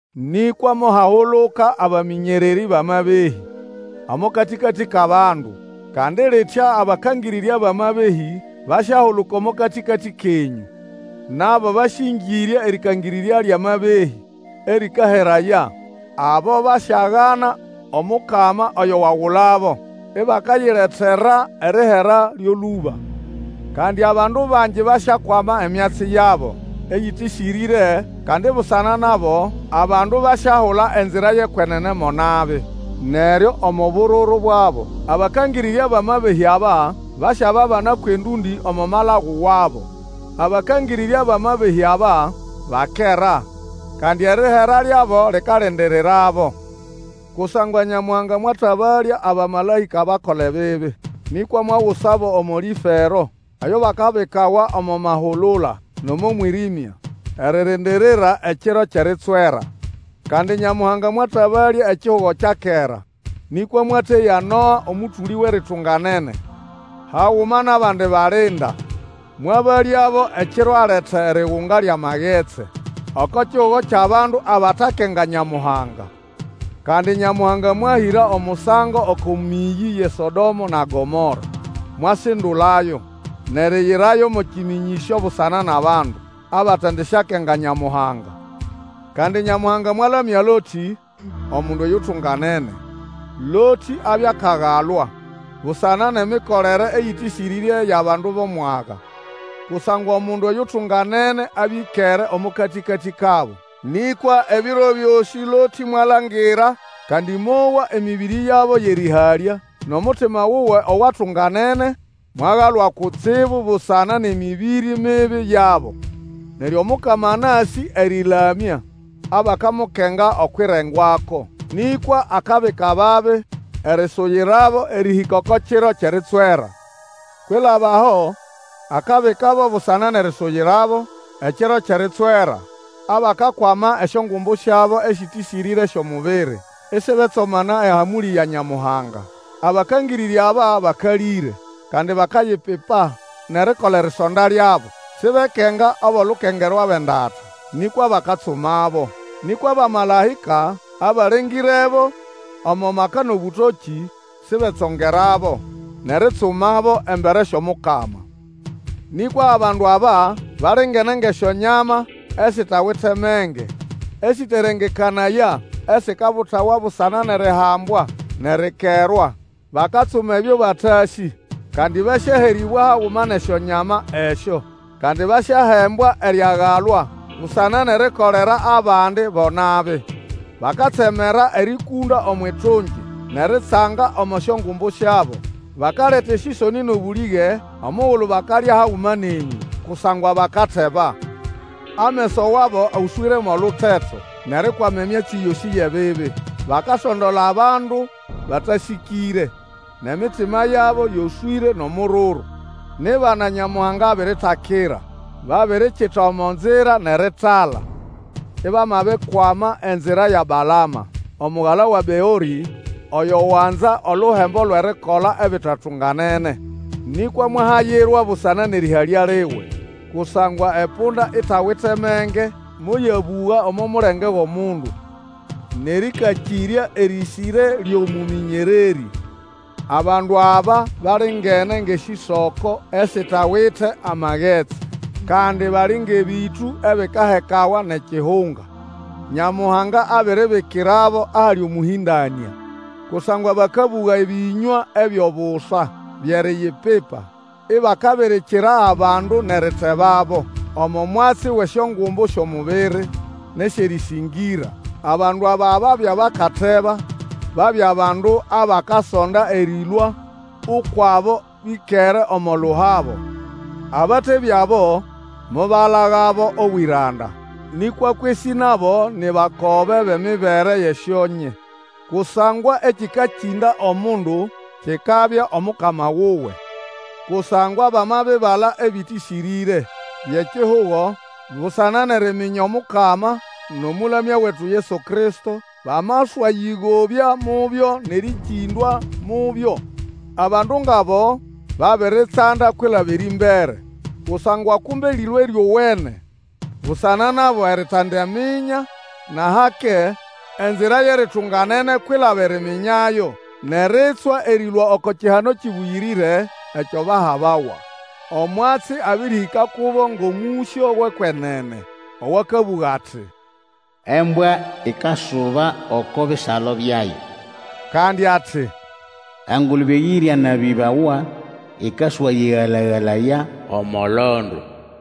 Nĩkwa mohahuluka abamĩnyererĩ bʼamabehĩ omo katĩkatĩ kʼabandu, kandi litya abakangĩrĩrya bʼamabehĩ basyahuluka omo katĩkatĩ kenyũ. Nabo basyĩngĩrya erĩkangĩrĩrya lyʼamabehĩ, erĩkaheraya. Abo basyagana Omukama oyo wagulabo, ibakayilretera erihera lyo lũba. Kandi abandu bangi basyakwama emyatsi yabo eyĩtĩsĩrĩre, kandi busana nabo, abandu basyahula enzira yʼekwenene mo nabi. Neryo omo muhuguru wabo abakangĩrĩrya bʼamabehĩ aba, basyababana kwʼendũndĩ omo malagu wabo abakangĩrĩrya bʼamabehĩ aba, bakera, kandi erihera lyabo likalindirirabo. Kusangwa Nyamuhanga mwatabalya abamalaĩka abakola ebibi, nĩkwa mwagusabo omo lĩfero eyo bakabikawa omo mahulula nʼomo mwĩrĩmya, eririndirira ekiro kyʼeritswera. Kandi Nyamuhanga mwatabalya ekihugo kya kera, nĩkwa mwateya Noa omũtũlĩ wʼeritunganene haguma nʼabandi balinda, mwabalyabo ekiro aleta erigunga lyʼamagetsi oko kihugo kyʼabandu abatakenga Nyamuhanga. Kandi Nyamuhanga mwahĩra omusango oko mĩyĩ yʼeSodomo na Gomora, mwasindulayo, nʼeriyirayo mo kĩmĩnyĩsyo busana nʼabandu abatendisyakenga Nyamuhanga. Kandi Nyamuhanga mwalamya Lotĩ, omundu oyutunganene. Lotĩ abya akagalwa busana nʼemikolere eyĩtĩsĩrĩre yʼabandu bʼomwaga. Kusangwa omundu oyutunganene abya ĩkere omo katĩkatĩ kabo. Nĩkwa ebiro byosĩ Lotĩ mwalangira, kandi mowa emĩbĩrĩ yabo yʼerĩhalya, nʼomutima wuwe owatunganene mwagalwa kutsibu busana nʼemĩbĩrĩ mibi yabo. Neryo Omukama anasĩ erĩlamya abakamukenga okwʼirengwako. Nĩkwa akabika ababi erisuyirabo erĩhĩka oko kiro kyʼeritswera. Kwilaba aho, akabikabo busana nʼerisuyirabo ekiro kyʼeritswera abakakwama esyongumbu syabo esĩtĩsĩrĩre syʼomubiri, isibetsomana ehamũlĩ ya Nyamuhanga. Abakangĩrĩrya aba bakalĩre, kandi bakayipipa, nʼerikola erisonda lyabo. Sibekenga abʼolukengerwa bʼendata, nĩkwa bakatsumabo. Nĩkwa abamalaĩka abalengĩrebo omo maka nʼobũtokĩ sibetsongerabo nʼeritsumabo embere syʼOmukama. Nĩkwa abandu aba balingene ngʼesyonyama esitawite menge, esĩterengekanaya, esikabutawa busana nʼerihambwa nʼerikerwa. Bakatsuma ebyo batasĩ, kandi basyaherĩbwa haguma nʼesyonyama esyo. Kandi basyahembwa eriagalwa busana nʼerikolera abandi bo nabi. Bakatsemera erĩkũnda omwʼitungi, nʼeritsanga omo syongumbu syabo. Bakaleta esĩsonĩ nʼobũlĩge omugulu bakalya haguma nenyũ, kusangwa bakateba. Ameso wabo oswĩre mʼoluteto nʼerikwama emyatsi yosĩ yʼebibi, bakasondola abandu batasĩkĩre, nʼemitima yabo yoswĩre nʼomururu; ni bana Nyamuhanga abiritakira. Babirikita omo nzira nʼeritala, ibamabikwama enzira ya Balama, omugala wa Beorĩ, oyo wanza oluhembo lwʼerikola ebitatunganene. Nĩkwa mwahayirwa busana nʼerĩhalya liwe. Kusangwa epunda itawite menge moyabũga omo mulenge wʼomundu, nʼerĩkakĩrya erĩsĩre lyʼomũmĩnyererĩ. Abandu aba balingene ngʼesĩsoko esitawite amagetsi, kandi bali ngʼebĩtũ ebikahekawa nʼekihunga. Nyamuhanga abiribikirabo ahali omũhĩndanĩa. Kusangwa bakabũga ebĩnywa ebyʼobusa byʼeriyipipa, ibakabirikira abandu nʼeritebabo omo mwatsi wʼesyongumbu syʼomubiri nʼesyʼerĩsĩngĩra. Abandu aba babya bakateba, babya bandu abakasonda erĩlũa ukwʼabo bĩkere omo luhabo. Abatebya abo mobalagabo obwĩranda, nĩkwa kwesĩ nabo ni bakobe bʼemibere yʼesyonye; kusangwa ekĩkakĩnda omundu kikabya omukama wuwe. Kusangwa bamabibala ebĩtĩsĩrĩre byʼekihugo busana nʼeriminya Omukama nʼomũlamya wetu Yesu Kristo, bamaswayĩgobya mubyo nʼerĩkĩndwa mubyo, abandu ngʼabo babiritsanda kwilaba erĩmbere. Kusangwa kumbe lĩlwe lyowene busana nabo eritindaminya nʼahake enzira yʼeritunganene kwilaba eriminyayo, nʼeritswa erĩlũa oko kihano kĩbũyĩrĩre ekyo bahabawa. Omwatsi abĩrĩhĩka kubo ngʼomũsyo wʼekwenene owakabũga ati, Embwa ikasuba oko bisalo byayo, kandi ati, Engulube eyĩryanabĩbawa ĩkaswayĩgala-galaya omo londo.